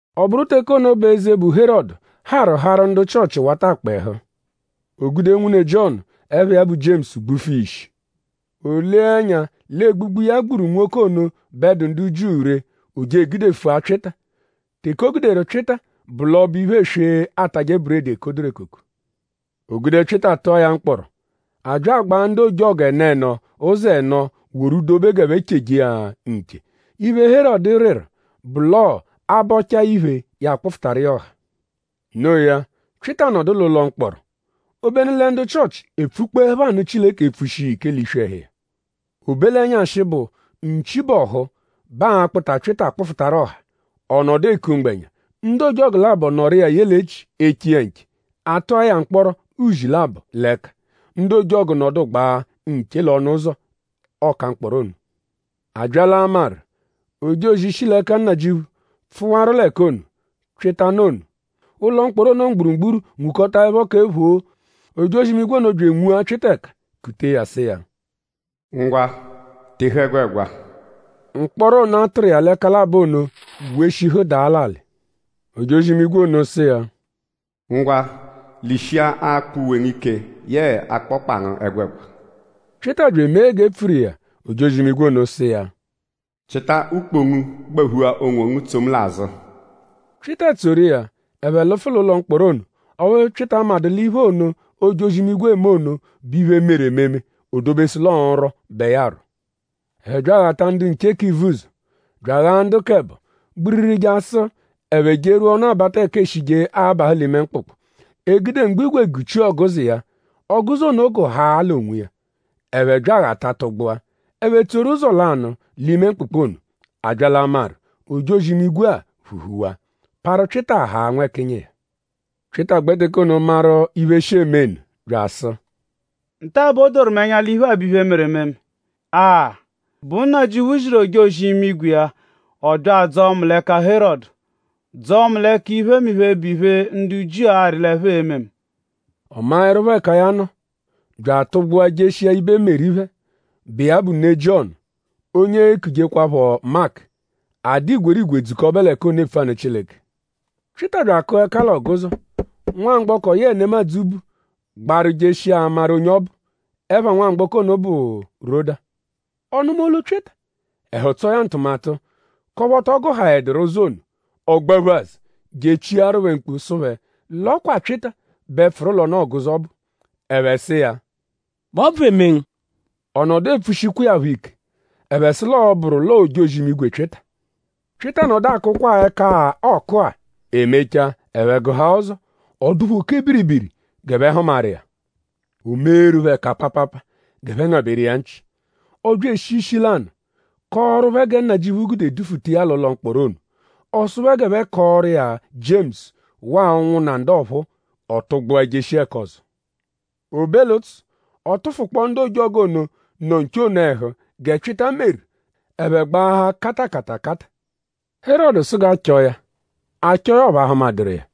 Ọ bụru teke ono bẹ eze, bụ Herọdu harụ harụ ndu Chịochi wata akpa ẹhu. O gude nwune Jiọnu, ẹpha iya bụ Jiemusu gbufu iya ishi. O lee ẹnya l'egbugbu, ya gburu nwoke ono bẹ dụ ndu Jiu ree; o je egudefua Pyịta. Teke o guderu Pyịta bụ l'ọbo-iphe eswe, aatajẹ buredi, ekoduru ekoko. O gude Pyịta tụa ya mkpọro. A bya agbàa ndu ojọgu ẹno ẹno ụzo ẹno woru dobe g'ẹphe cheje iya nche. Iphe, Herọdu rịru bụ l'ọo a -bọchaa iphe ya akpụfutaru iya ọha. Noo ya; Pyịta nọdu l'ụlo mkpọro; obenu lẹ ndu Chịochi epfukpọepho anụ Chileke epfushi iya ike l'iswi ẹhu iya. O be l'ẹnyashi, bụ nchi -bọhu bẹ aa-kpụta Pyịta kpụfutaru ọha; ọ nọdu eku mgbẹnya; ndu ojọgu labọ nọru iya ye l'echi eche iya nche. A tụa ya mkpọro uzi labọ l'ẹka. Ndu ojọgu nọdugbaa nche l'ọnu-ụzo ọka-mkpọro ono. A bya l'amarụ; ojozi, shi l'ẹka Nnajịuphu pfụwaru l'ẹka ono, Pyịta nọ ono. Ụlo mkpọro ono mgburugburu nwukọtaepho kẹ phoo. Ojozi-imigwe ono bya enwua Pyịta ẹka kutee ya sụ iya: “Ngwa; tehu ẹgwegwa!” Mkpọro ono, a tụru iya l'ẹka labọ ono weshihu daa l'alị. Ojozi-imigwe ono sụ iya: “Ngwa; lishia akpọ uwe ngu ike yee akpọkpa ngu ẹgwegwa!” Pyịta bya emee g'e pfuru iya. Ojozi-imigwe ono sụ iya: “Chịta ukpo ngu gbaphua onwongu tso mu l'azụ.” Pyịta tsoru iya; ẹphe lụfu l'ụlo mkpọro ono. Ọphu Pyịta amadụ l'iphe ono, ojozi-imigwe eme ono bụ iphe, meru ememe. O dobesụ l'ọo nrwọ bẹ ya arwọ. Ẹphe bya aghata ndu nche k'ivuzọ; bya aghaa ndu k'ẹbo gbiriri jasụ ẹphe jerwua ọnu-abata ẹka eeshije abahụ l'ime mkpụkpu. E gude mgbo-ígwè guchia ọguzo iya. Ọguzo ono gụhaa l'onwiya; ẹphe bya aghata tụgbua. Ẹphe tsoru ụzo lanụ l'ime mkpụkpu ono. A bya l'amarụ; ojozi-imigwe-a phuhuwaa; parụ Pyịta haa nwẹkinyi iya. Pyịta gbẹ teke ono maru iphe shi eme nụ bya asụ: “Nta bẹ o doru mu ẹnya l'iphe-a, bụ iphe, meru ememe! Aa!?Bụ Nnajịuphu ziru ojozi-imigwe iya; ọ bya adzọo mu l'ẹka Herọdu; dzọo mu l'ẹka iphemiphe, bụ iphe, ndu Jiu arị l'ẹphe e-me mu.” Ọ maẹrupho ẹka ya nọ; bya atụgbua jeshia ibe Meri phẹ, bụ iya bụ ne Jiọnu onye eekujekwaphọ Maku. A dụ igwerigwe dzukọbe l'ẹka ono epfu anụ Chileke. Pyịta bya akụa ẹka l'ọguzo. Nwamgbọko, yẹe nemadzụ bu gbaru jeshia amaru onye ọ bụ. Ẹpha nwamgbọko ono bụ Roda. Ọ nụma olu Pyịta; ẹhu tsọo ya ntụmatu k'ọphu ọ tọ gụhaeduru ụzo ono; ọ gbaphu azụ je echiaru phẹ mkpu sụ phẹ l'ọ kwa Pyịta bẹ pfụru l'ọnu-ọguzo ọbu. Ẹphe sụ iya: “?Bụ ọbvu eme ngu?” Ọ nọdu epfushikwa iya phọ ike. Ẹphe sụ l'ọo-bụru l'ọo ojozi-imigwe Pyịta. Pyịta nọdu akụkwa-a ẹka-a, ọoku-a. E mechaa; ẹphe gụhaa ụzo. Ọ dụ phẹ oke biribiri g'ẹphe hụmaru iya. O meeru phẹ ẹka paapaapa g'ẹphe ngabẹru iya nchị. Ọ bya eshi ishi lanụ kọoru phẹ gẹ Nnajịuphu gude dufuta iya l'ụlo mkpọro ono. Ọ sụ phẹ g'ẹphe kọoru iya Jiemusu waa ụnwunna ndu ọphuu. Ọ tụgbua jeshia ẹka ọzo. O be l'ụtsu; ọ tụfukpoo ndu ojọgu ono, nọ nche ono ẹhu gẹ Pyịta meru. Ẹphe gbaahaa katakatakata. Herọdu sụ g'a chọo ya. A chọo ya; ọphu a hụmaduru iya.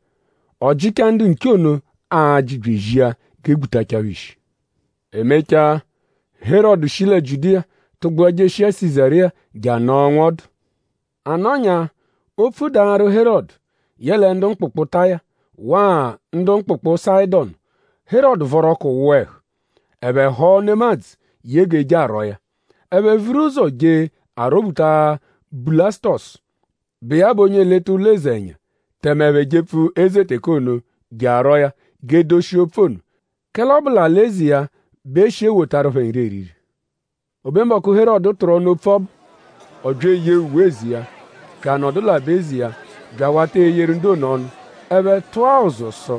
Ọ jịchaa ndu nche ono ajị bya ezia g'e gbutachaa phẹ ishi. E mechaa; Herọdu shi lẹ Jiudiya tụgbua jeshia Sizariya je anọo nwọdu. A nọnyaa; opfu daru Herọdu yẹle ndu mkpụkpu Taya; waa ndu mkpụkpu Sayịdonu. Herọdu vọru ọku wụa ẹhu. Ẹphe họo nemadzụ ye g'e je arwọo ya. Ẹphe vuru ụzo je arwọ-buta Bulasutọsu, bụ iya bụ onye eleta ụlo eze ẹnya; tẹme ẹphe jepfu eze teke ono je arwọo ya g'e doshia opfu ono; kẹle ọ bụ l'alị-eze iya bẹ e shi ewotaru phẹ nri eriri. O be mbọku, Herọdu tụru ọnu opfu ọbu; ọ bya eyee uwe eze iya; bya anọdu l'aba-eze iya bya awata eyeru ndu ono ọnu. Ẹphe tụa ụzu sụ: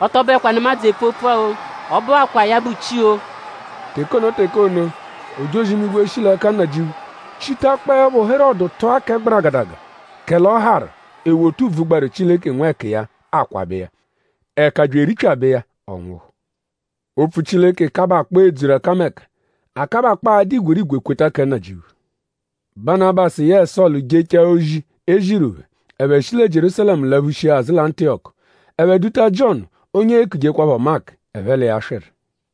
“Ọ tọ bụekwa nemadzụ epfu opfua-o. Ọ bụakwaa ya bụ chi-o!” Teke ono teke ono; ojozi-imigwe, shi l'ẹka Nnajịuphu chitakpọepho Herọdu tụa kẹ gbaragadaga; kẹle ọ harụ; e wota ùbvù, gbaru Chileke nwẹkiya akwabẹ iya. Ẹ̀kà bya eripyabẹ iya; ọ nwụhu. Opfu Chileke kabakpọo edzuru ẹkameka; a kabakpọo adụ igwerigwe kweta kẹ Nnajịuphu. Banabasu yẹe Sọlu jechaa ozi, e ziru phẹ; ẹphe shi lẹ Jierúsalẹmu laphushia azụ lẹ Antiyọku. Ẹphe duta Jiọnu onye eekujekwaphọ Maku; ẹphe l'iya swịru.